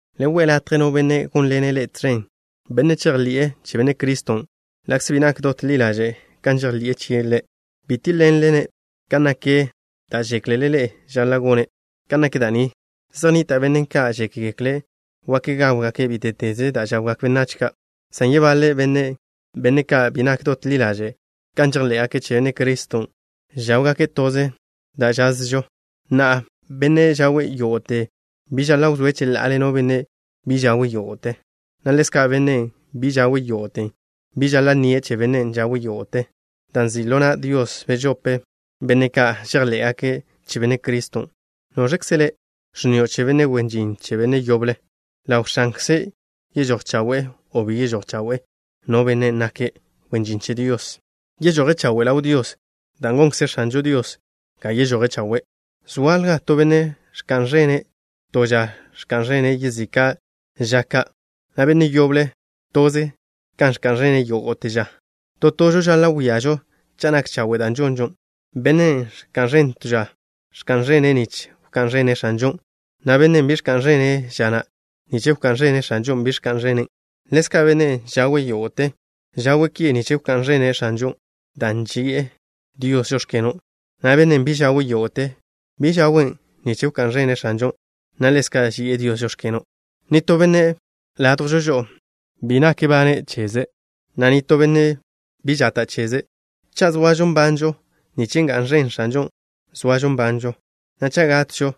Le we' latje no benne' gónḻene' ḻe'e tẕen, benne' žejḻi'e che Benne' Criston', ḻa'kze bi nak dot ḻi ḻaže' kan žejḻi'e chie' Ḻe'. Bi tíḻ-ḻenle-ne' kan nak da' žéklele ḻe'e žaḻa' gone'. Kan nak da' ni, zej nnita' benne' ka' žékgekle' wak gáwgake' bíte'teze da' žawgak benách ka', san yebaḻe benne', benne' ka' bi nak dot ḻi ḻaže' kan žejḻé'gake' che Benne' Criston', žáwgake' toze da' žazžo. Na'a, bennen' žawe' yógo'te bi žaḻa' wzóe' cheḻa'ale no benne' bi žawe' yógo'te, na' ḻezka', bennen' bi žawe' yógo'te bi žaḻa' nnie' che bennen' žawe' yógo'te, dan' nzi' ḻo na' Dios bežope benne' ka' žejḻé'gake' che Benne' Criston'. ¿Noẕkze le', ẕnnio' che benne' wen žin che benne' yoble? Ḻaw X̱ankze yežój chawe' o bi yežój chawe' no bennen' nake' wen žin che Dios. Yežoje' chawe' ḻaw Dios, dan' gonkze X̱anžo Dios ga yežoje' chawe'. Zoalja to benne' ẕka'n ẕenže' to ža ka ẕka'n ẕene' yezika' ža ka', na' benne' yoble, toze kan ẕka'n ẕene' yógo'te ža. To tožo žaḻa' wíažo cha' nak chawe' da' žonžo. Bennen' ẕka'n ẕene' to ža, ẕka'n ẕenen' nich wká'n ẕene' X̱anžon', na' bennen' bi ẕka'n ẕene' ža na', nich wká'n ẕene' X̱anžon' bi ẕka'n ẕenen'. Ḻezka', bennen' žawe' yógo'te, žawe' ki nich wká'n ẕene' X̱anžon', dan' ži'e Dios: “Žóx̱keno'” na' bennen' bi žawe' yógo'te, bi žawen' nich wká'n ẕene' X̱anžon', na' ḻezka' ži'e Dios: “Žóx̱keno'.” Nitó benne' ládjwžo žo'o bi nak bane' cheze', na' nitó benne' bi žate' cheze'. Cha' zoažo nbanžo, nich ga'n ẕen X̱anžon' zoažo nbanžo, na' cha' gatžo,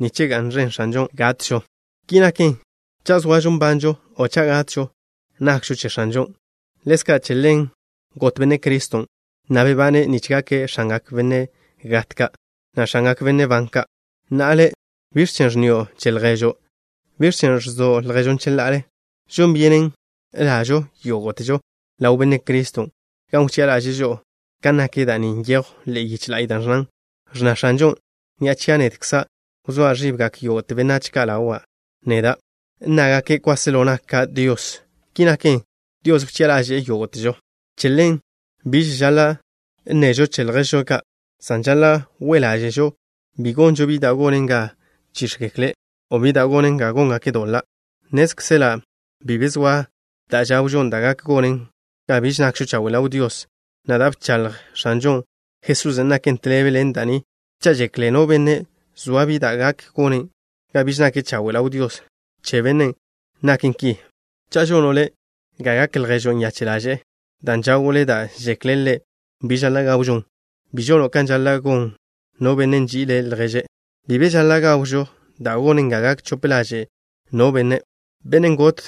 nich ga'n ẕen X̱anžon' gatžo. Ki naken, cha' zoažo nbanžo o cha' gatžo, nakžo che X̱anžon'. Ḻezka' che ḻen got Benne' Criston', na' bebane', nich gake' X̱angak benne' gat ka', na' X̱angak benne' ban ka'. Na'a le', ¿biẕ chen' ẕnnio' che lježo'? ¿Biẕ chen' ẕzo' lježon' cheḻa'ale? Žon byenen ḻa'žo yógo'težo ḻaw Benne' Criston' gan wchi'a ḻaže'e žo'o. Kan nak da' ni nyejw ḻe'e yiche la'y da' ẕnnan: Ẕnna X̱anžo: “Ni'a chia' nedkza', wzóa ẕibgak yógo'te benách ka' ḻawa' neda'. Nnágake' kwáselo naka' Dios.” Ki naken, Dios wchi'a ḻaže'e yógo'težo. Che ḻen, biž žaḻa' nnežo che lježžo ka', san žaḻa' we' ḻáže'žo bi gonžo bi da' gonen ga chíx̱gekle', o bi da' gonen ga góngake' doḻa'. Nnézkzela' bi be zoa da' žawžon da' gak gonen ga biž nakžo chawe' ḻaw Dios, na' da' bchaḻj X̱anžo Jesusen' naken tḻebe ḻen da' ni. Cha' žekle no benne' zoa bi da' gak gonen ga biž nake' chawe' ḻaw Dios, che bennen', naken ki. Cha' žono' le' ga gak lježo' nyache' ḻaže'e, dan' žawo' le' da' žekle' ḻe' bi žaḻa' gawžon, bi žono' kan žaḻa' gon no benne' nži'ile' lježe'. Bi be žaḻa' gawžo da' gonen ga gak chope ḻaže' no benne', bennen' got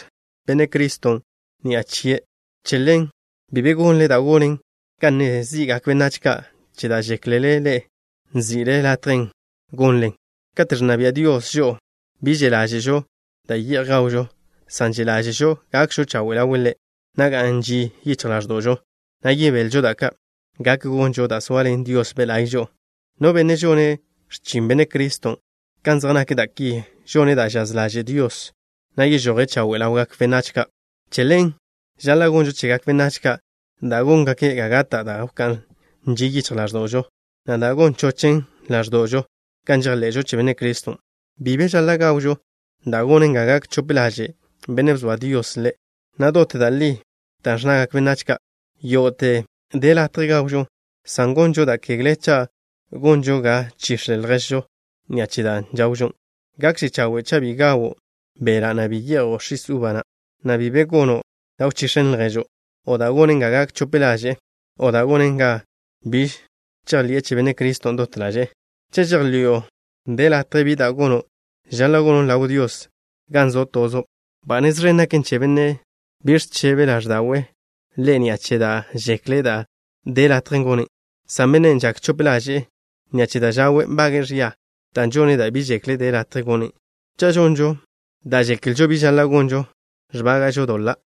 Benne' Criston' ni'a chie'. Che ḻen, bi be gonle da' gonen ga nne zi'gak benách ka' che da' žéklele ḻe'e nzi'le latje gonlen. Kate' ẕnna bia' Dios žo'o, bi že' ḻáže'žo da' ye'j gawžo, san že' ḻáže'žo gakžo chawe' ḻawe' Ḻe', na' ga'n ži yichj ḻáẕdo'žo, na' yebelžo, da' ka' gak gonžo dan' zoaḻen Dios Be' La'y žo'o. No benne' žone' x̱chin Benne' Criston' kan zej nak da' ki, žone' da' žaz ḻaže' Dios, na' yežoje' chawe' ḻawgak benách ka'. Che ḻen žaḻa' gonžo chegak benách ka' da' góngaken ga gata' da' wká'n ži yichj ḻáẕdo'žo, na' da' gon chochen ḻáẕdo'žo kan žejḻe'žo che Benne' Criston'. Bi be žaḻa' gawžo da' gonen ga gak chope ḻaže' bennen' bzoa Dios ḻe'. Nak dot da' li dan' ẕnnagak benách ka': “Yógo'te de latje gawžon” san gonžo da' kegle cha' gonžo ga chix̱le lježžo ni'a che da' žawžo. Gakže chawe' cha' bi gawo' beḻa', na' bi ye'jo' x̱is uba, na' bi be gono' da' wchix̱en lježo', o da' gonen ga gak chope ḻaže'e, o da' gonen ga biž žejḻi'e che Benne' Criston' dot ḻaže'e. Cha' žejḻi'o de latje bi da' gono', žaḻa' gonon' ḻaw Dios gan zo' tozo'. Ba nez ẕen gaken che bennen' bi ẕchebe ḻáẕda'we' ḻe' ni'a che da' žekle' de latje gone', san bennen' žak chope ḻaže'e ni'a che da' žawe', nbage'e ẕia, dan' žone' da' bi žekle' de latje gone'. Cha' žonžo da' žeklžo bi žaḻa' gonžon, ẕbága'žo doḻa'.